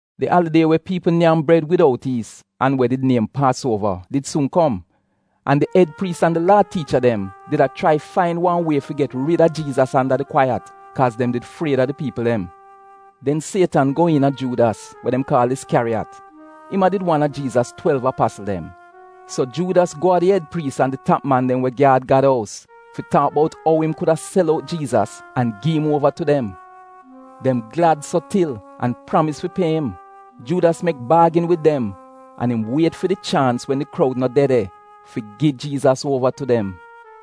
Di alidie we piipl nyam bred widout yiis an we did niem Paasuova, did suun kom an di ed priis an di Laa tiicha dem, did a chrai fain wan wie fi get rid a Jiizas anda di kwaiyat, kaaz dem did fried a di piipl dem. Den Sietan go iina Juudas, we dem kaal Iskyariyat, im a did wan a Jiizas Twelv apasl dem. So, Juudas go a di ed priis an di tap man dem we gyaad Gad ous fi taak bout ou im kuda sel out Jiizas an gi im uova tu dem. Dem glad so til an pramis fi pie im. Juudas mek baagin wid dem, an im wiet fi di chaans, wen di kroud no de de fi gi Jiizas uova tu dem.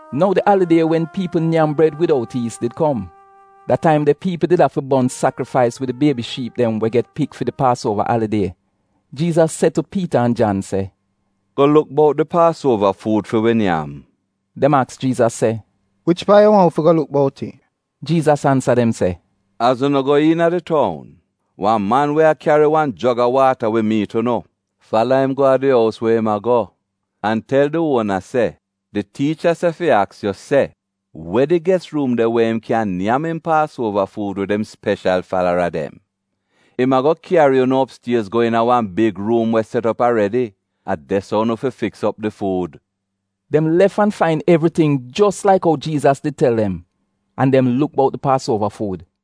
Nou di alidie wen piipl nyam bred widout yiis did kom. Da taim de piipl did afi bon sakrifais wid di biebi shiip dem we get pik fi di Paasuova alidie. Jiizas se tu Piita an Jan se, “Go luk bout di Paasuova fuud fi wi nyam.” Dem aks Jiizas se, “Wich paat yu waahn wi fi go luk bout it?” Jiizas ansa dem se, “Az unu go iina di toun, wan man we a kyari wan jog a waata wi miit unu. Fala im go a di ous we im a go, an tel di uona se, ‘Di tiicha se fi aks yu se: We di ges ruum de, we im kyan nyam mi Paasuova fuud wid im speshal falara dem?’ Im ago kyari unu opstiez go iina wan big ruum we set op aredi. A de-so unu fi fiks op di fuud.” Dem lef an fain evriting jos laik ou Jiizas did tel dem. An dem luk bout di Paasuova fuud.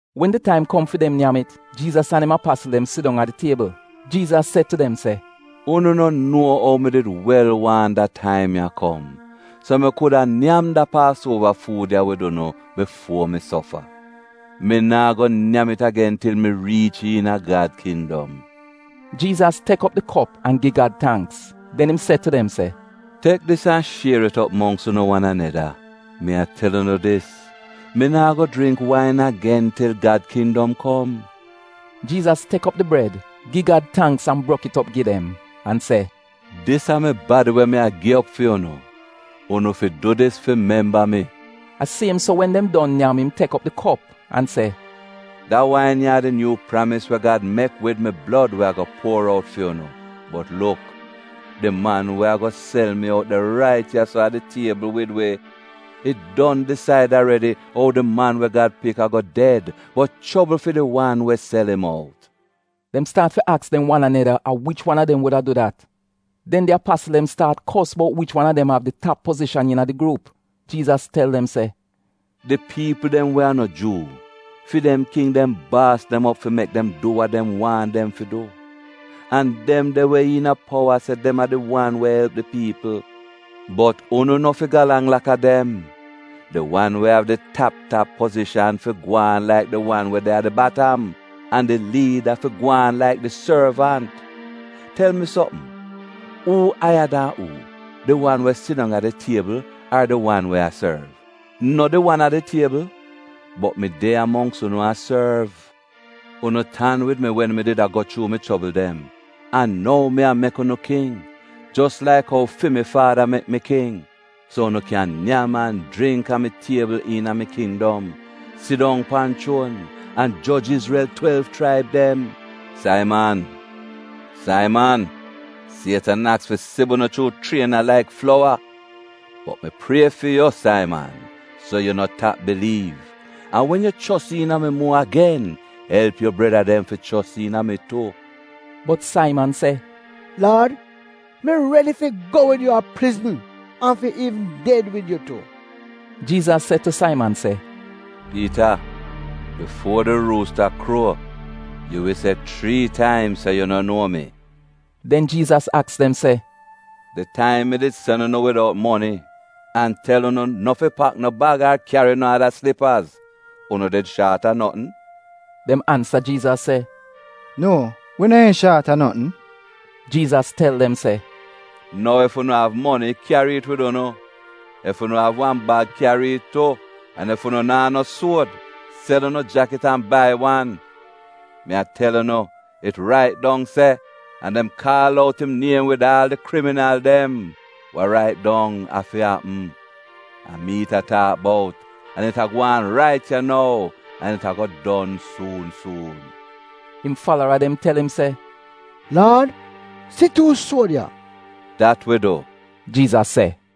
Wen di taim kom fi dem nyam it, Jiizas an im apasl dem sidong a di tiebl. Jiizas se tu dem se, “Unu no nuo ou mi did wel waahn da taim ya kom so mi kuda nyam da Paasuova fuud ya wid unu bifuo mi sofa. Mi naa go nyam it agen til mi riich iina Gad kindom.” Jiizas tek op di kop an gi Gad tangks. Den im se tu dem se, “Tek dis an shier it op mongks unu wan aneda. Mi a tel unu dis mi naa go jringk wain agen, til Gad kindom kom.” Jiizas tek op di bred, gi Gad tangks an brok it op gi dem, an se, “Dis a mi badi, we mi a gi op fi unu. Unu fi du dis fi memba mi.” A siem so wen dem don nyam, im tek di kop an se, “Da wain ya a di nyuu pramis wa Gad mek wid mi blod we ago puor out fi unu. Bot luk, di man we ago sel mi out de rait ya-so a di tiebl wid wi. It don disaid aredi ou di Man we Gad Pik ago ded bot chobl fi di wan we sel im out.” Dem staat fi aks dem wan aneda, a wich wan a dem wuda du dat. Den di apasl dem staat kos bout wich wan a dem av di tap pozishan iina di gruup. Jiizas tel dem se, “Di piipl dem we a no Juu, fi dem king dem baas dem op fi mek dem du we dem waahn dem fi du; an dem de we iina powa se dem a ‘di wan we elp di piipl.’ Bot unu no fi galang laka dem. Di wan we av di tap tap pozishan fi gwaan laik di wan we de a di batam, an di liida fi gwaan laik di sorvant. Tel mi sopm, uu aiya dan uu? Di wan we sidong a di tiebl ar di wan we a sorv? No di wan a di tiebl? Bot mi de ya mongks unu a sorv. Unu tan wid mi wen mi did a go chuu mi chobl dem. An nou mi a mek unu king, jos laik ou fi mi Faada mek mi king, so unu kyan nyam an jringk a mi tiebl iina mi kindom, sidong pan chuon, an joj Izrel twelv chraib dem. “Saiman, Saiman, Sietan aks fi sib unu chuu chriena laik flowa. Bot mi prie fi yu, Saiman, so yu no tap biliiv. An wen yu chos iina mi muo agen, elp yu breda dem fi chos iina mi tu.” Bot Saiman se “Laad, mi redi fi go wid yu a prizn an fi iivn ded wid yu tu.” Jiizas se tu Saiman se, “Piita, bifuo di ruusta kruo, yu wi se chrii taim se yu no nuo mi.” Den Jiizas aks dem se, “Di taim mi did sen unu widout moni, an tel unu no fi pak no bag ar kyari no ada slipaz, unu did shaat a notn?” Dem ansa Jiizas se, “Nuo wi neehn shaat a notn.” Jiizas tel dem se, “Nou, ef unu av moni kyari it wid unu, ef unu av wan bag kyari it tu, an ef unu naa no suod, sel unu jakit an bai wan. Mi a tel unu, it rait dong se, ‘An dem kaal out im niem wid aal di kriminal dem.’ Wa rait dong, afi apm. A mi it a taak bout an it a gwaan rait ya nou an it ago don suun suun.” Im falara dem tel im se, “Laad, si tuu suod ya.” “Dat wi du,” Jiizas se.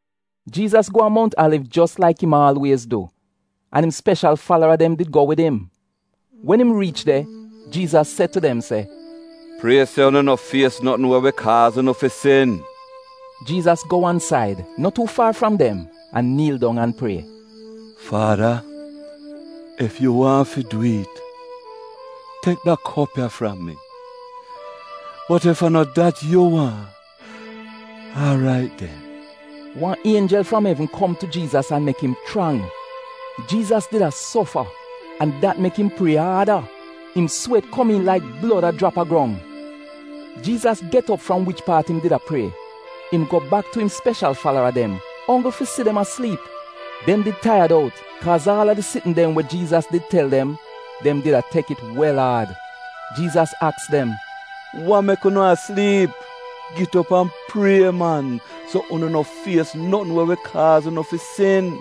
Jiizas go a Mount Aliv jos laik im aalwiez du, an im speshal falara dem did go wid im. Wen im riich de, Jiizas se tu dem se, “Prie se unu no fies notn we wi kaaz unu fi sin.” Jiizas go wan said, no tuu faar fram dem an niil dong an prie, “Faada, ef yu waahn fi dwi'it, tek da kop ya fram mi, bot ef a no dat yu waahn, aarait den.” Wan ienjel fram evn kom tu Jiizas an mek im chrang. Jiizas did a sofa an dat mek im prie aada. Im swet komiin laik blod a jrap a grong Jiizas get op fram wich paat im did a prie. Im go bak tu im speshal falara dem, onggl fi si se dem a sliip. Dem did taiyad out kaaz aal a di sitn dem we Jiizas did tel dem, dem did a tek it wel aad. Jiizas aks dem, “Wa mek unu a sliip? Git op an prie man so unu no fies notn we wi kaaz unu fi sin.”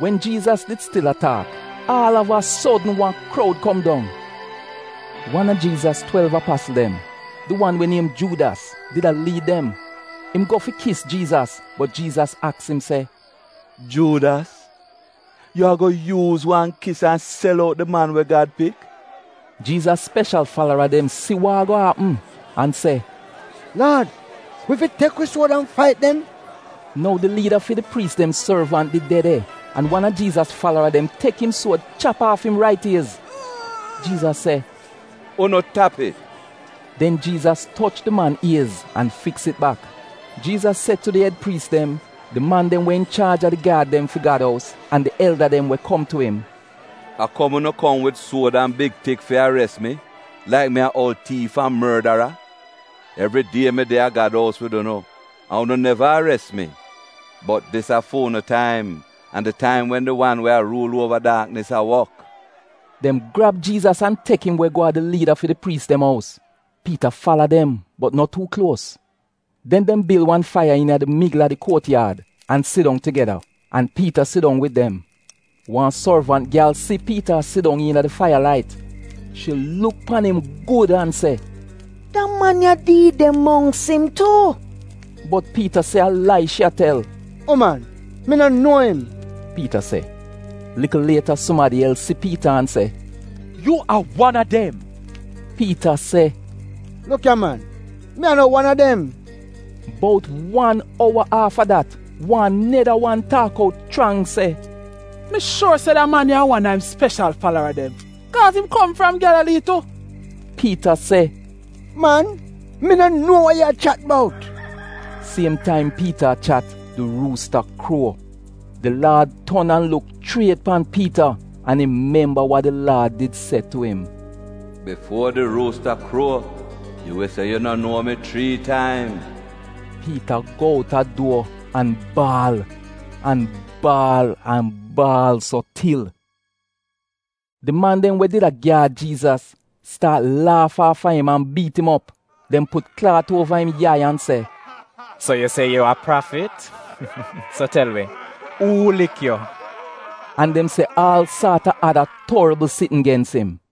Wen Jiizas did stil a taak, aal av a sodn wan kroud kom dong. Wan a Jiizas twelv apasl dem, di wan we niem Juudas, did a liid dem. Im go fi kis Jiizas, bot Jiizas aks im se, “Juudas, yu ago yuuz wan kis an sel out di Man we Gad Pik?” Jiizas speshal falara dem si wa ago apm an se, “Laad, wi fi tek wi suod fait dem?” Nou, di liida fi di priis dem sorvant did de de an wan a Jiizas falara dem tek im suod chap aaf im rait iez. Jiizas se, “Unu tap it!” Den Jiizas toch di man iez an fiks it bak. Jiizas se tu di ed priis dem, di man dem we inchaaj a di gyaad dem fi Gad ous an di elda dem we kom tu im, “A kom unu kom wid suod an big tik fi ares mi laik mi a oul tiif an mordara? Evridie mi de a Gad ous wid unu, an unu neva ares mi. Bot dis a fu'unu taim an di taim wen di wan we ruul uova daaknis a wok.” Dem grab Jiizas, an tek im we go a di liida fi di priis dem ous. Piita fala dem bot no tuu kluos. Den dem bil wan faiya iina di migl a di kuotyaad an sidong tugeda, an Piita sidong wid dem. Wan sorvant gyal si Piita a sidong iina di faiya-lait. Shi luk pan im gud an se, “Da man ya did de mongks im tu!” Bot Piita se a lai shi a tel. “Uman, mi no nuo im,” Piita se. Likl lieta sumadi els si Piita an se, “Yu a wan a dem.” Piita se, “Luk ya man! Mi a no wan a dem!” Bout wan ouwa aafa dat wan neda wan taak out chrang se, “Mi shuor se da man ya a wan a im speshal falara dem kaaz im kom fram Gyalalii tu.” Piita se, “Man, mi no nuo we yu a chat bout!” Siem taim, Piita a chat, di ruusta kruo. Di Laad ton an luk chriet pan Piita an im memba wa di Laad did se tu im “Bifuo di ruusta kruo, yu wi se yu no nuo mi chrii taim.” Piita go out a duor an baal, an baal, an baal so til. Di man dem we did a gyaad Jiizas staat laaf aafa im an biit im op. Dem put klaat uova im yai an se, “So yu se yu a prafit, so tel wi, uu lik yu?” An dem se aal saat a ada torbl sitn gens im.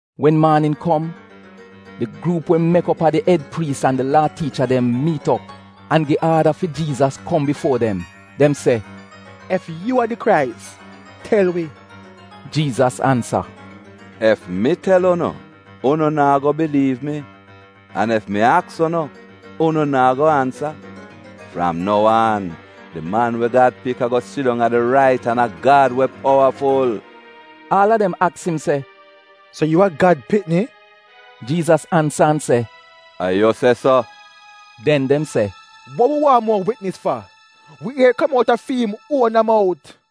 Wen maanin kom, di gruup we mek op a di ed priis an di Laa tiicha dem, miit op, an gi aada fi Jiizas kom bifuo dem. Dem se, “Ef yu a di Krais, tel wi.” Jiizas ansa, “Ef mi tel unu, unu naa go biliiv mi, an ef mi aks unu, unu naa go ansa. Fram nou aan, di Man we Gad Pik ago sidong a di rait an a Gad, we powaful.” Aal a dem aks im se, “So yu a Gad pikni?” Jiizas ansa an se, “A yu se so.” Den dem se, “Wa wi waahn muo witnis fa? Wi ier it kom out a fi'im uona mout.”